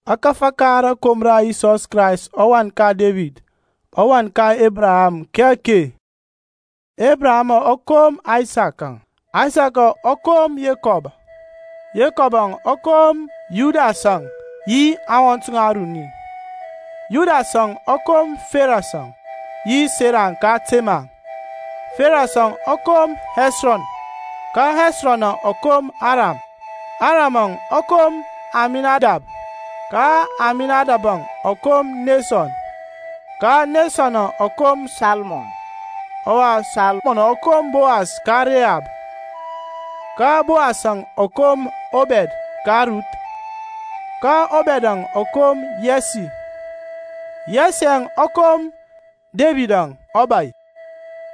Ȧkȧfȧ ka rȧkom ra Yisɔs Krayst ɔWan ka Debid, ɔwan ka Ebraham, ki ake. Ebrahamȧŋ ɔ kom Aysakȧŋ, Aysak ɔ kom Yekɔbȧŋ, Yekɔb ɔ kom Yudasȧŋ yi aŋwɔnt ŋɔŋ aruni. Yudasȧŋ ɔ kom Ferɛs yi Sara ka Temar; Ferɛsȧŋ ɔ kom Hɛsrɔn; ka Hɛsrɔnȧŋ ɔ kom Aram; Eramȧŋ ɔ kom Aminadab; ka Aminadabȧŋ ɔ kom Nesɔn; ka Nesɔnȧŋ ɔ kom Salmɔn; ɔwa Salmɔnȧŋ ɔ kom Bowas ka Rehab; ka Bowasȧŋ ɔ kom Obɛd ka Ruth; ka Obɛdȧŋ ɔ kom Yɛsi; Yɛsiȧŋ ɔ kom Debidȧŋ ɔbȧy;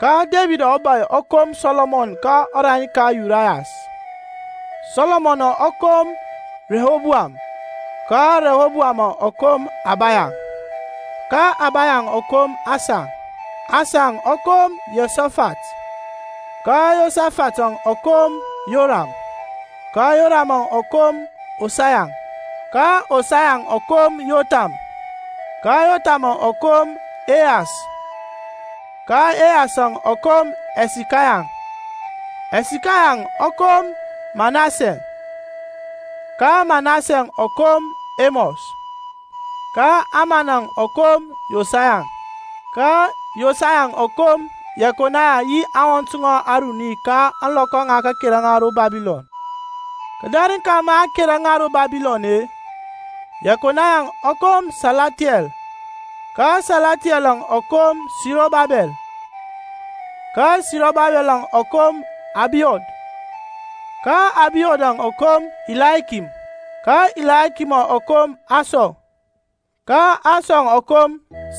ka Debid ɔbȧy ɔ kom Sɔlɔmɔn ka ɔrani ka Urayas; Sɔlɔmɔnȧŋ ɔ kom Rihoboam; ka Rihoboamȧŋ ɔ kom Abaya; ka Abayaŋ ɔ kom Asa; Asaŋ ɔ kom Yehosafat; ka Yehosafatȧŋ ɔ kom Yoram; ka Yoramȧŋ ɔ kom Osaya; ka Osayaŋ ɔ kom Yotham; ka Yothamȧŋ ɔ kom Ehas; ka Ehasȧŋ ɔ kom Hɛsikaya; ka Hɛsikayaŋ ɔ kom Manasɛ; ka Manasɛŋ ɔ kom Emɔs; ka Amanȧŋ ɔ kom Yosaya; ka Yosayaŋ ɔ kom Yɛkonaya, yi aŋwɔnt ŋɔŋ aruni ka ȧŋlɔkɔ a kera ŋa ro Babilɔn. Kǝdarǝŋ ka ma a kera ŋa ro Babilɔn-e, Yɛkonayaŋ ɔ kom Salathiyɛl; ka Salathiɛlȧŋ ɔ kom Sirɔbabɛl; ka Sirɔbabɛlȧŋ ɔ kom Abiud; ka Abiudȧŋ ɔ kom Ilayakim; ka Ilayakimȧŋ ɔ kom Asɔr; ka Asɔr ɔ kom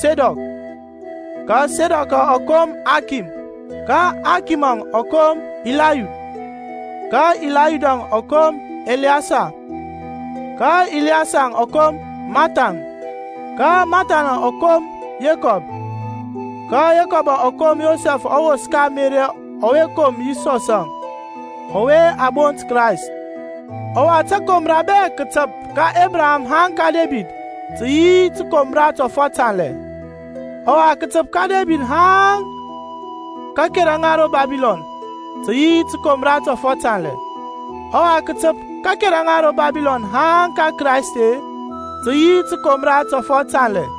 Sedɔk; ka Sedɔkȧŋ ɔ kom Akim; ka Akimȧŋ ɔ kom Ilayud; ka Ilayudȧŋ ɔ kom Ɛliyesar; ka Ɛliyesarȧŋ ɔ kom Mȧthan; ka Mȧthanȧŋ ɔ kom Yekɔb; ka Yekɔbȧŋ ɔ kom Yosɛf ɔwos ka Meri ɔwe kom Yisɔsȧŋ, ɔwe a bont Krayst. Ɔwa takomra bɛ kǝtǝp ka Ebraham haŋ ka Debid tǝ yi tǝkomra tɔfɔt tanlɛ; ɔwa kǝtǝp ka Debid haŋ ka kakera ŋa ro Babilɔn tǝ yi tǝkomra tɔfɔt tanlɛ; ɔwa kǝtǝp ka kakera ŋa ro Babilɔn haŋ ka Kraist-e, tǝ yi tǝkomra tɔfɔt tanlɛ.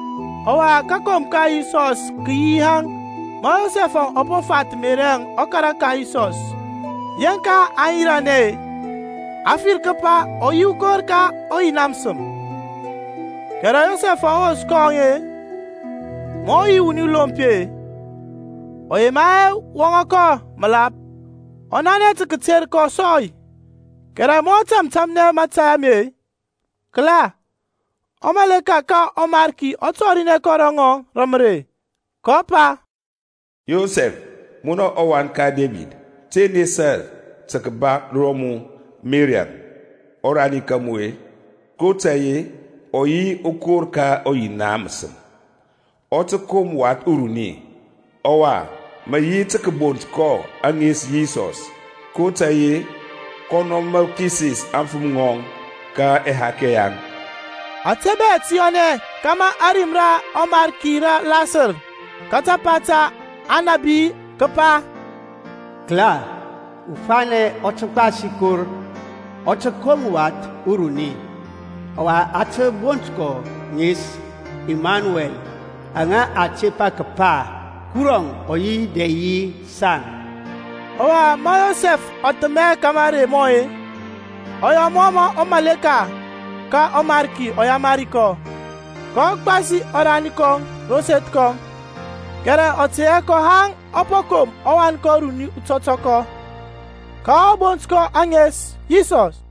Ɔwa kakom ka Yisɔs kǝ yi yaŋ; ma Yosɛf ɔ po fath Meriȧŋ ɔkara ka Yisɔs, yeŋka aŋ yiranɛ-e, a fir kǝpa ɔ yi ukor ka ɔYina mǝsǝm. Kɛrɛ Yosɛfȧŋ ɔwos kɔŋ-e, ma ɔ yi wuni lompi-e, ɔ yema hɛ wɔŋȧ kɔ mǝlap-e, ɔ nanɛ tǝ kǝter kɔ sɔy. Kɛrɛ ma ɔ tȧmtȧmnɛ mȧtȧy ame-e, kǝla, ɔmaleka ka ɔMarki ɔ tɔrinɛ ro ŋɔŋ rǝ mǝrei, kɔ pa, Yosɛf, munɔ ɔwan ka Debid, te nesa tǝ kǝba ro mu Meriȧŋ, ɔrani ka mu-e, kotȧy-e ɔ yi ukor ka ɔYina mǝsǝm. Ɔ tǝ kom wath uruni. Ɔwa mǝ yi tǝ kǝbont kɔ ŋes Yisɔs, kotȧy-e kɔnɔ mǝ kisis aŋfǝm ŋɔŋ ka ɛhakɛ yaŋ. Ȧte bɛ tǝ yɔnɛ kȧmȧ ȧrim ra ɔMarki rǝ lasǝr ka tapa ta aŋnabi-e, kepa Kǝla, ufanɛ ɔ tǝ gbasi kor, Ɔ tǝ kom wath uruni, Ɔwa a tǝ bont kɔ ŋes, Imanuɛl, (aŋa a tepa kǝpa Kuruȧŋ ɔ yi dɛ yi saŋ). Ɔwa ma Yosɛf ɔ thǝmɛ ka mȧrey mɔŋ-e, ɔ yɔ mɔ mǝ ɔmaleka ka ɔMarki ɔ yamari kɔ, kɔ gbasi ɔrani kɔŋ ro seth kɔŋ. Kɛrɛ ɔ tɛ hɛ kɔ haŋ ɔ po kom ɔwan kɔŋ uruni utɔtɔkɔ. Ka a bont kɔ ŋes Yisɔs.